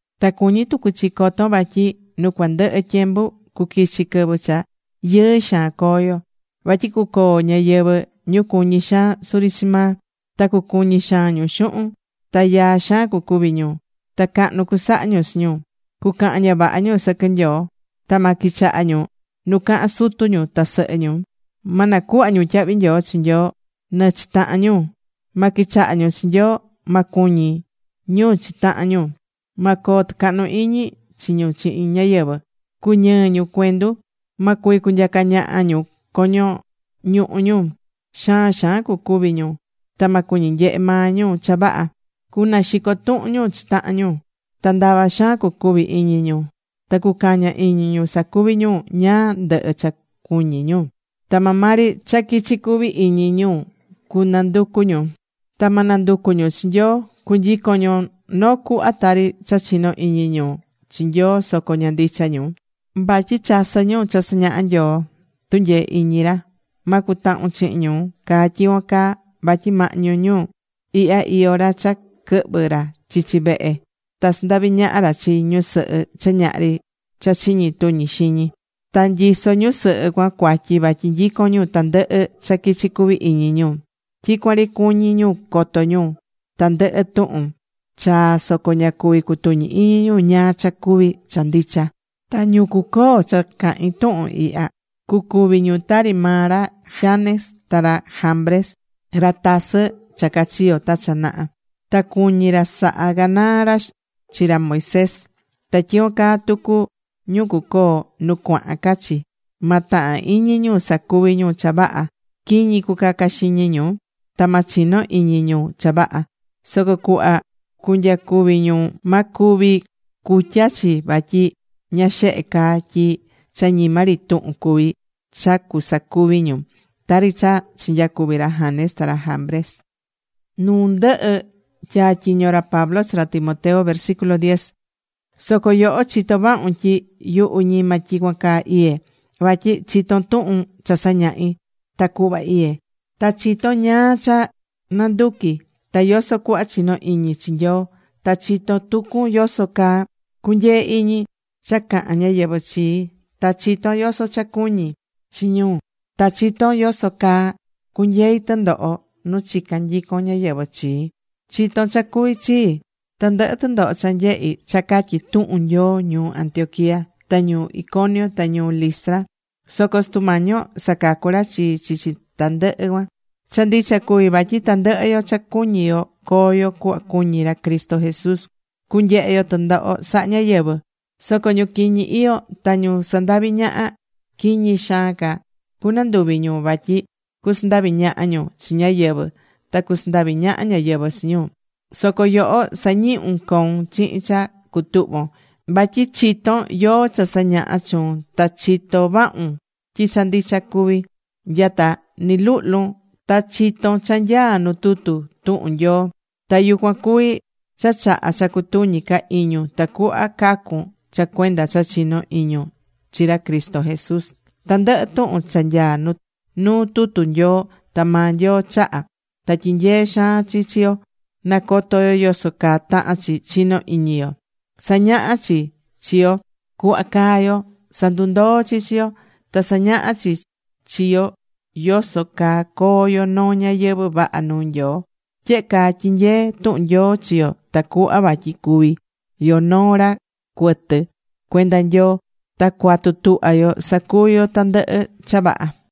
Ta cuñí tucu chi co̱ton vatyi nu cuandɨhɨ tyembu cuquichi quɨvɨ cha yɨɨ xaan coo yo. Vatyi cucoo ñáyɨvɨ ñu cuñí xaan suri chi maa. Ta cucuñi xaan ñu xuhun. Ta yaa xaan cucuvi ñu. Ta cahnu cusaha ñu chi ñu. Cucahan ña vaha ñu sɨquɨ Nyoo. Ta ma quichaha ñu nu cahán sutu ñu ta sɨhɨ ñu. Ma nacuhva ñu tyahvi nyoo chi Nyoo, nɨ chi tahan ñu. Ma quichaha ñu chi Nyoo. Ma cuñi ñu chi tahan ñu. Ma coo tɨcahnu iñi chi ñu chihin ñáyɨvɨ. Cuñɨɨ ñu cuendu. Ma cuvi cunyaca ñaha ñu coño ñuhu ñu. Xaan xaan cucuvi ñu. Ta ma cuñi nyehe maa ñu cha vaha. Cunaxico tuhun ñu chi tahan ñu. Ta ndava xaan cucuvi iñi ñu. Ta cucaña iñi ñu sacuvi ñu ñáá ndɨhɨ cha cuñí ñu. Ta maa maa ri cha quichi cuvi iñi ñu cunanducu ñu, ta ma nanducu ñu chi Nyoo. Cunyicon ñu noo cuhva tari cha chinó iñi ñu chi Nyoo, soco ña ndicha ñu. Vatyi chasɨ́ ñu cha sañahá Nyoo tunyee iñi ra. Ma cutahun chihin ñu caa tyicuan caa. Vatyi mahñu ñu ihya iyó ra cha quɨhvɨ ra chichi vehe ta sandavi ñaha ra chi ñusɨhɨ cha ñahri cha chiñi tuñi xiñi. Ta nyisó ñusɨhɨ cuan cuatyi, vatyi nyicón ñu tandɨhɨ cha quichi cuvi iñi ñu. Tyicuan ri cuñí ñu coto ñu tandɨhɨ tuhun chaa soco ña cuví cutuñi iñi ñu ñáá cha cuvi cha ndicha. Ta ñu cucoo cha cahin tuhun ihya, cucuvi ñu tari maa ra Janes ta ra Jambres, ra tasɨ cha cachiyo̱ ta cha naha. Ta cuñi̱ ra saha canaa ra chi ra Moisés. Ta tyicuan caa tucu ñu cucoo nu cuahan ca chi. Ma tahan iñi ñu sacuvi ñu cha vaha. Quiñi cucaca xiñi ñu. Ta ma chino iñi ñu cha vaha. Soco cuhva cunyacuvi ñu ma cuvi cutya chi vatyi ña xehe caa tyi cha ñima ri tuhun cuví cha cusacuvi ñu, tari cha chinyacuvi̱ ra Janes ta ra Jambres.Nu ndɨhɨ tyatyiño̱ ra Pablo chi ra Timoteo Soco yoho chitó vahun tyi yuhu ñima tyicuan caa iyé. Vatyi chitón tuhun cha sañahí, ta cuhva iyé. Ta chitón ñáá cha nanduquí ta yoso cuhva chinó iñi chi Nyoo. Ta chitó tucun yoso caa cunyeé iñi cha cahán ñáyɨvɨ chii. Ta chitón yoso cha cuñí chi ñu. Ta chitón yoso caa cunyeí tɨndoho nu chicán nyicon ñáyɨvɨ chii. Chito̱n cha cuvi̱ chii, tandɨhɨ tɨndoho cha nyehi̱ cha catyi tuhun Nyoo ñuu Antioquía, ta ñuu Iconio, ta ñuu Listra. Soco Sutu Mañi yo sacacu̱ ra chii chichi tandɨhɨ cuan. Cha ndicha cuví vatyi tandɨhɨ yo cha cuñí yo coo yo cuhva cuñí ra Cristo Jesús cunyehe yo tɨndoho saha ñáyɨvɨ. Soco ñu quiñi iyó ta ñu sandaví ñaha, quiñi xaan ca cunanduvi ñu. Vatyi cusandavi ñaha ñu chi ñáyɨvɨ ta cusandavi ñaha ñáyɨvɨ chi ñu. Soco yoho sa̱ñihun coun chihin cha cutuhvo̱n. Vatyi chitón yóó cha sañaha̱ chuun ta chitó vahun tyi cha ndicha cuví. Nya ta ni luhlun ta chitón cha nyaá nu tutu tuhun Nyoo. Ta yucuan cuví cha chahá cha cutuñi ca iñun tacuhva cacun cha cuenda cha chinó iñun chi ra Cristo Jesús. Tandɨhɨ tuhun cha nyaá nuu tutu Nyoo, ta maa Nyoo chaha̱. Ta tyinyeé xaan chi chi yo nacoto yo yoso caa tahán chi chinó iñi yo. Sañahá chi chi yo cuhva caa yo. Sandundoó chi chi yo. Ta sañahá chi chi yo yoso caa coo yo noo ñayɨvɨ̱ vaha nuu Nyoo. Tyehe caa tyinyeé tuhun Nyoo chi yo tacuhva vatyi cuví yo noo ra cuɨtɨ cuenda Nyoo. Ta cuatu tuhva yo sacuvi yo tandɨhɨ cha vaha.